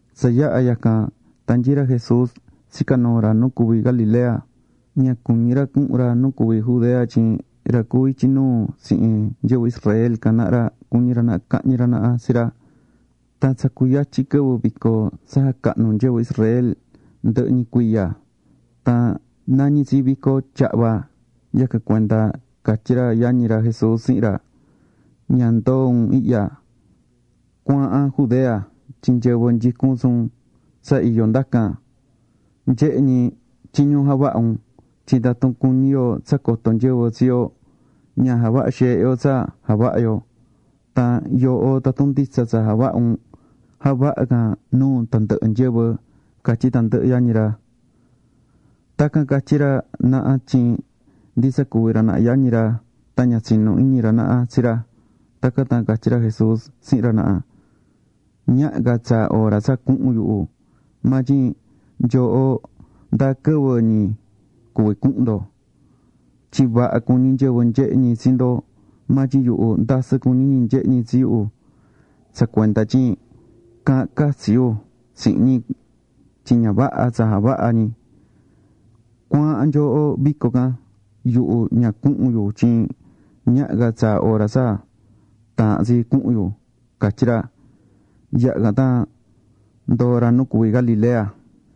Tsa yaha̱ yacan, tan nyií ra Jesús tsicá nuu ra nu cuví Galilea. Ña cuñí ra cuhun ra nu cuví Judea tyin ra cuví ityi nuu tsihin nyɨvɨ Israel can naha ra cuñí ra naha cahñi ra naha tsi ra. Tan tsa cuyatyin quɨvɨ vico tsa jacahnú nyɨvɨ Israel ndɨhɨ ñi cuiya. Tan nañí tsi Vico Tyahva. Yacan cuenda catyí ra yañi ra Jesús tsihin ra: ―Ña ndoo un ihya. Cu̱aahan Judea tyin nyɨvɨ nyicún tsi un tsa iyó ndacan nyehe ñi tyiñu javahá un. Tyin tatun cuñí yo tsa coto nyɨvɨ tsi yo, ña javahá xeehe yo tsa javahá yo. Tan yooho tatun nditsa tsa javahá un, ja̱vaha can nuu tandɨhɨ nyɨvɨ ―catyí tandɨhɨ yañi ra. Tacan catyí ra naha tyin ndi tsa cuví ra naha yañi ra tan ña tsinú iñi ra naha tsi ra. Tacan tan catyí ra Jesús tsihin ra naha: ―Ñaha ca tsaa hora tsa cuhun yuhu. Maa tyin nyooho ndáa quɨvɨ ñi cuví cuhun ndo. Tyin vaha cuñí nyɨvɨ nyehé ñi tsi ndo, maa tyin yuhu ndasɨ cuñí ñi nyehé ñi tsi yu tsa cuenda tyin caahán catsi yu tsihin ñi tyin ña vaha tsa javahá ñi. Cu̱aahan nyooho vico can. Yuhu ña cuhun yu tyin ñaha ca tsaa hora tsa taahán tsi cuhun yu ―catyí ra. Yaha̱ can tan ndoo̱ ra nu cuví Galilea.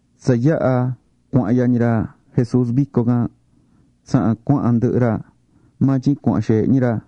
Tsa yaha̱ cuahán yañi ra Jesús vico can, tsahan cuahán ndɨhɨ ra, maa tyin cuahán xeehe ñi ra.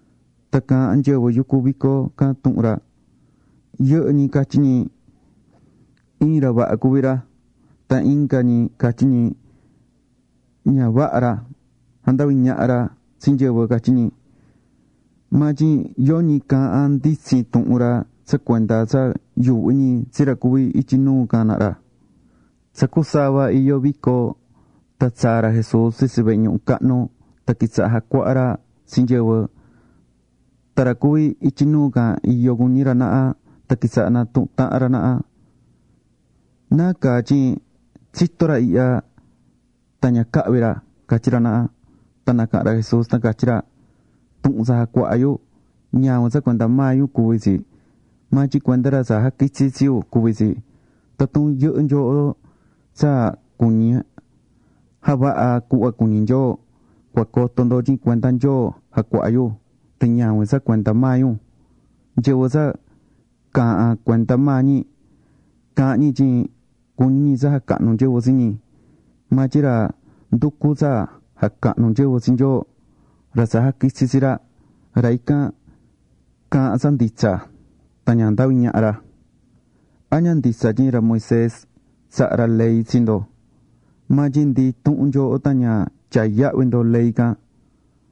Tan caahán nyɨvɨ yucú vico can tuhun ra. Yɨhɨ́ ñi catyí ñi: “Iin ra vaha cuví ra.” Tan inga ñi catyí ñi: “Ña vaha ra, jandaví ñaha ra tsi nyɨvɨ”, catyí ñi. Maa tyin yoñi caahán nditsin tuhun ra tsa cuenda tsa yuuhví ñi tsi ra cuví ityi nuu can naha ra. Tsa cusava iyó vico tan tsaa̱ ra Jesús tsitsi vehe ñuhu cahnu tan quitsaha̱ jacuaha ra tsi nyɨvɨ. Tan ra cuví ityi nuu can iyó cuñí ra naha tan quitsaha̱ natuhun tahan ra naha: ―¿Nacaa tyin tsitó ra ihya tan ña cahvi̱ ra? ―catyí ra naha. Tan nacaha̱n ra Jesús tan catyí ra: ―Tuhun tsa jacuahá yu, ñavin tsa cuenda maa yu cuví tsi, maa tyin cuenda ra tsa jaquitsi̱ tsi yu cuví tsi. Tatun yɨhɨ́ nyooho tsa cuñí javaha cuhva cuñí Nyoo, cua coto ndo tyin cuenda Nyoo jacuahá yu tan ñavin tsa cuenda maa yu. Nyɨvɨ tsa caahán cuenda maa ñi, caahán ñi tyin cuñí ñi tsa jacahnu nyɨvɨ tsi ñi. Maa tyin ra nducú tsa jacahnu nyɨvɨ tsi Nyoo, ra tsa jaquitsi̱ tsi ra, ra ican caahán tsa nditsa. Tan ña jandaví ñaha ra. ’¿A ña nditsa tyin ra Moisés tsaha̱ ra ley tsi ndo? Maa tyin ndi intuhun nyooho tan ña tyaá yahvi ndo ley can.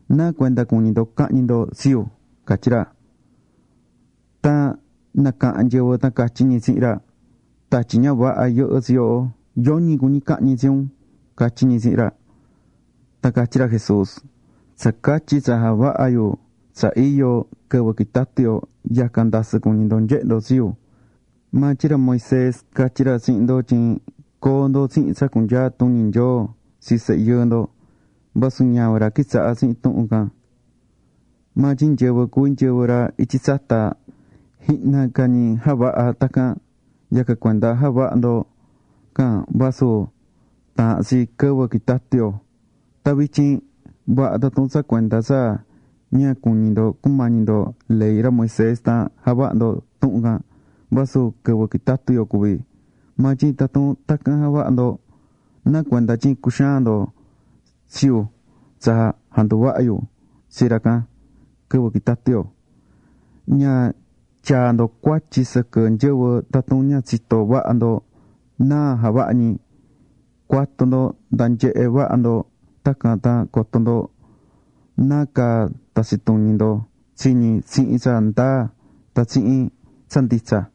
¿Nacuenda cuñí ndo cahñi ndo tsi yu? ―catyí ra. Tan nacaha̱n nyɨvɨ tan catyí ñi tsihin ra: ―Tatyi ña vaha yɨhɨ́ tsi yooho. Yoñi cuñí cahñi tsi un ―catyí ñi tsihin ra. Tan catyí ra Jesús: ―Tsacatyi tsa javaha̱ yu tsa iyo quɨvɨ quitatu yo, yacan ndasɨ cuñí ndo nyehé ndo tsi yu. Maa tyin ra Moisés catyí ra tsihin ndo tyin coo ndo tsihin tsa cunyaa tuñi Nyoo tsi sehe yɨɨ ndo. Vasu ñavin ra quitsaha̱ tsihin tuhun can, maa tyin nyɨvɨ cuví nyɨvɨ ra ityi tsata, jihna ca ñi javaha̱ tacan. Yacan cuenda javahá ndo can vasu taahán tsi quɨvɨ quitatu yo. Tan vityin, vaha tatun tsa cuenda tsa ña cuñí ndo cumañi ndo ley ra Moisés tan javahá ndo tuhun can vasu quɨvɨ quitatú yo cuví. Maa tyin tatun tacan javahá ndo, ¿nacuenda tyin cuxaan ndo tsi yu tsa janduvaha̱ yu tsi ra can quɨvɨ quitatú yo? Ña tyaa ndo cuatyi sɨquɨ nyɨvɨ tatun ña tsitó vaha ndo náa javahá ñi. Cu̱atu ndo nda nyehe vaha ndo, tacan tan coto ndo nácaa tatsi tuñi ndo tsi ñi tsihin tsa ndaa tan tsihin tsa nditsa.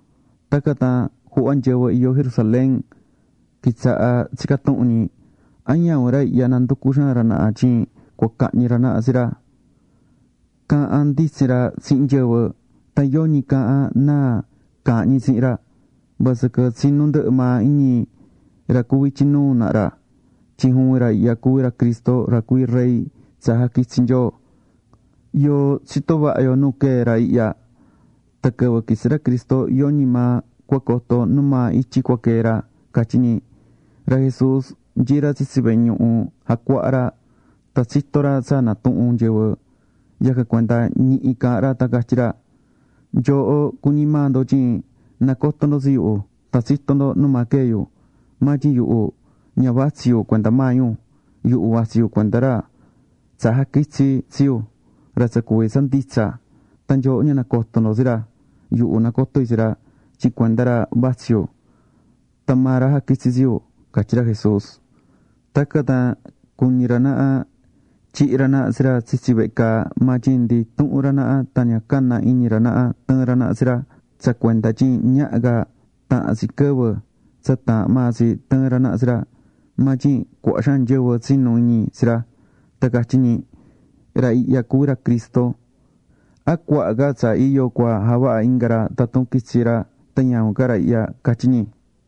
Tacan tan juhva nyɨvɨ iyó Jerusalén, quitsaha̱ tsicá tuhun ñi: ―¿A ñavin ra ihya nanducú xaan ra naha tyin cua cahñi ra naha tsi ra? Caahán nditsin ra tsihin nyɨvɨ. Tan yoñi caahán náa caahán tsihin ra. Vasɨquɨ tsinú ndɨhɨ maa iñi ra cuví ityi nuu naha ra tyin juvin ra ihya cuví ra Cristo ra cuví rey tsa jaquitsi̱ Nyoo. Yoo tsitó vaha yo nu quee̱ ra ihya, tan quɨvɨ quitsi ra Cristo yoñi maa cua coto numaa ityi cua quee̱ ra ―catyí ñi. Ra Jesús nyií ra tsitsi vehe ñuhu jacuahá ra, tan tsitó ra tsa natuhún nyɨvɨ, yacan cuenda ñihi caha̱n ra tan catyí ra: ―¡Nyooho cuñí maa ndo tyin nacotó ndo tsi yu tan tsitó ndo numaa quee̱ yu! Maa tyin yuhu ña vatsí yu cuenda maa yu. Yuhu vatsí yu cuenda ra tsa jaquitsi̱ tsi yu, ra tsa cuví tsa nditsa. Nyooho ña nacotó ndo tsi ra. Yuhu nacotó yu tsi ra tyin cuenda ra vatsí yu, tan maa ra jaquitsi̱ tsi yu ―catyí ra Jesús. Tacan tan cuñí ra naha tyihi ra naha tsi ra tsitsi vehe caa. Maa tyin ndi intuhun ra naha tan ña caná iñi ra naha tɨɨ̱n ra naha tsi ra tsa cuenda tyin ñaha ca tahan tsi quɨvɨ tsa taahán maa tsi tɨɨn ra naha tsi ra. Maa tyin cuaha xaan nyɨvɨ tsinu̱ iñi tsi ra. Tan catyí ñi: ―Ra ihya cuví ra Cristo. ¿A cuaha ca tsa iyo cua javaha inga ra tatun quitsi ra tan ñavin ca ra ihya? ―catyi ñi.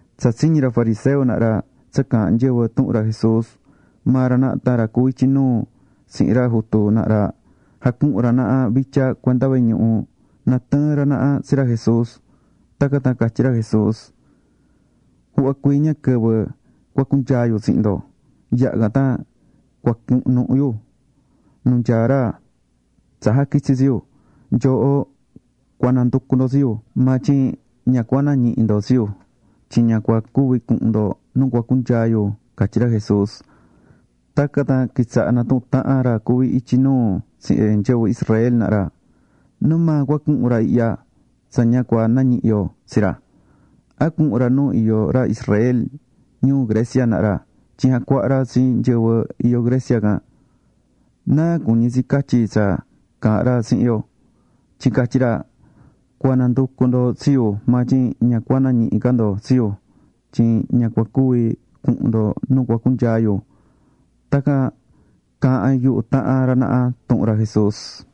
Tsa tsiñi̱ ra fariseo naha ra tsa caahán nyɨvɨ tuhun ra Jesús, maa ra naha tan ra cuví ityi nuu tsihin ra jutu naha ra, jacuhu̱n ra naha vitya cuenda vehe ñuhu, na tɨɨn ra naha tsi ra Jesús. Tacan tan catyí ra Jesús: ―Juhva cuii ña quɨvɨ cua cunyaa yu tsihin ndo. Yaha̱ can tan cuacunuhu yu nu nyaá ra tsa jaquitsi̱ tsi yu. Nyooho cua nanducu ndo tsi yu. Maa tyin ña cua nañihi ndo tsi yu. Tyin ña cua cuvi cuhun ndo nu cua cunyaa yu ―catyí ra Jesús. Tacan tan quitsaha̱ natuhún tahan ra cuví ityi nuu tsihin nyɨvɨ Israel naha ra: ―¿Numaa cua cuhun ra ihya tsa ña cua nañihi yo tsi ra? ¿A cuhun ra nu iyó ra Israel ñuu Grecia naha ra tyin jacuaha ra tsi nyɨvɨ iyó Grecia can? ¿Náa cuñí tsi catyi tsa caahán ra tsihin yo? Tyin catyi ra: “Cua nanducu ndo tsi yu maa tyin ña cua nañihi ca ndo tsi yu tyin ña cua cuvi cuhun ndo nu cua cunyaa yu” ―tacan caahán yuhu tahan ra naha tuhun ra Jesús.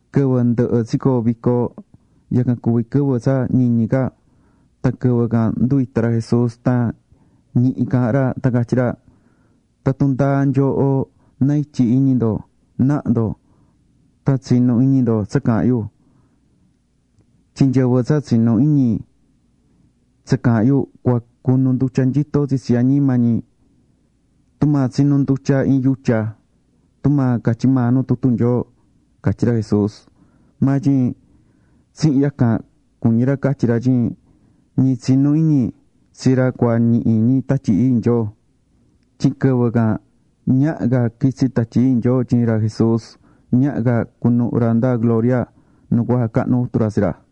Quɨvɨ ndɨhɨ tsicoo̱ vico, yacan cuví quɨvɨ tsa ñiñi ca. Tan quɨvɨ can nduvita̱ ra Jesús tan ñihi caahán ra tan catyí ra: ―Tatun ndáa nyooho na ityi iñi ndo, na̱ha ndo tan tsi̱nu iñi ndo tsa caahán yu. Tyin nyɨvɨ tsa tsinú iñi tsa caahán yu, cua cunu ndutya nyito tsitsi añima ñi tumaa tsinú ndutya iin yutya, tumaa catyí maa nu tutu Nyoo ―catyí ra Jesús. Maa tyin tsihin yacan cuñí ra catyi ra tyin ñi tsinú iñi tsi ra cua ñihi ñi Tatyi Ii Nyoo, tyin quɨvɨ can ñaha ca quitsi Tatyi Ii Nyoo tyin ra Jesús, ñaha ca cunuhu ra nda gloria nu cua jacahnu Jutu ra tsi ra.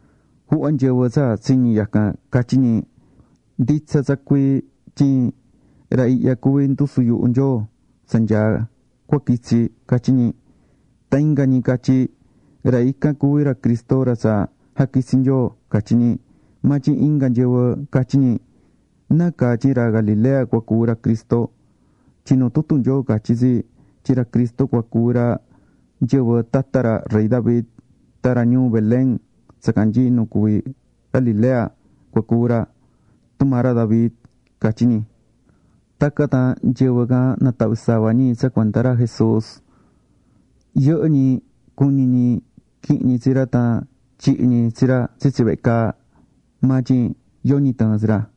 Juhva nyɨvɨ tsa tsiñi̱ yacan, catyí ñi: ―Nditsa tsa cuii tyin ra ihya cuví ndusu yuhu Nyoo tsa nyaá tsa cua quitsi ―catyí ñi. Tan inga ñi catyí ñi: ―Ra ican cuví ra Cristo ra tsa jaquitsi̱ Nyoo ―catyí ñi. Maa tyin inga nyɨvɨ catyí ñi: ―¿Nacaa tyin ra Galilea cua cuvi ra Cristo? Tyin nu tutu Nyoo catyí tsi tyin ra Cristo cua cuvi ra nyɨvɨ tata ra rey David, tan ra ñuu Belén tsa canyií nu cuví Galilea cua cuvi ra, tumaa ra David ―catyí ñi. Tacan tan nyɨvɨ can natahvi̱ sava ñi tsa cuenda ra Jesús. Yɨhɨ́ ñi cuñí ñi quihin ñi tsi ra tan tyihi ñi tsi ra tsitsi vehe caa. Maa tyin yoñi tɨɨ̱n tsi ra.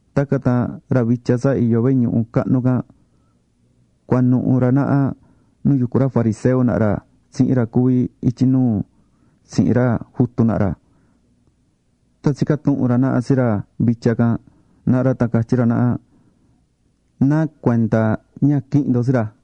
Tacan tan ra vitya tsa iyó vehe ñuhu cahnu can, cuanuhu ra naha nu yucú ra fariseo naha ra tsihin ra cuví ityi nuu tsihin ra jutu naha ra. Tan tsica̱ tuhun ra naha tsi ra vitya can naha ra tan catyí ra naha: ―¿Nacuenda ña quihi̱n ndo tsi ra?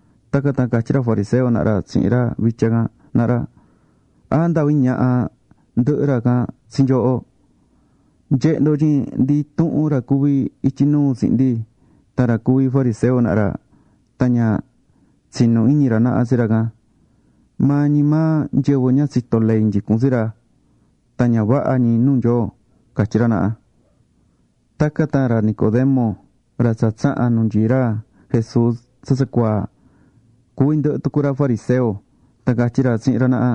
Tacan tan catyí ra fariseo naha ra tsihin ra vitya can naha ra: ―¿A jandavi̱ ñaha ndɨhɨ ra can tsi nyooho? Nye̱he ndo tyin ndi intuhun ra cuví ityi nuu tsihin ndi, tan ra cuví fariseo naha ra, tan ña tsinú iñi ra naha tsi ra can. Maa ñi maa nyɨvɨ ña tsitó ley nyicún tsi ra. Tan ña vaha ñi nuu Nyoo ―catyí ra naha. Tacan tan ra Nicodemo, ra tsa tsaha̱n nu nyií ra Jesús tsa tsacuaa, cuví ndɨhɨ tucu ra fariseo, tan catyí ra tsihin ra naha: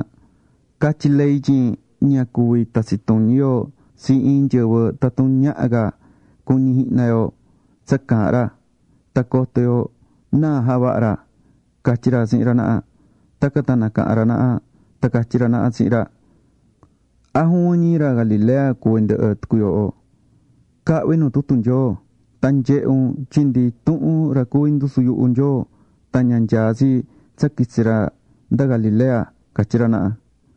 ―Catyí ley tyin ña cuví tatsi tuñi yo tsi iin nyɨvɨ tatun ñaha ca cuñi jihna yo tsa caahán ra, tan coto yo náa javaha̱ ra ―catyí ra tsihin ra naha. Tacan tan nacaha̱n ra naha tan catyí ra naha tsihin ra: ―¿A juvin ñi ra Galilea cuví ndɨhɨ tucu yooho? Ca̱hvi nu tutu Nyoo tan nye̱he un, tyin ndi intuhun ra cuví ndusu yuhu Nyoo tan ña nyaá tsi tsa quitsi ra nda Galilea ―catyí ra naha.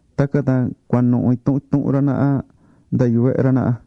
Tacan tan cuanuhu intuhun intuhun ra naha nda yuvehe ra naha.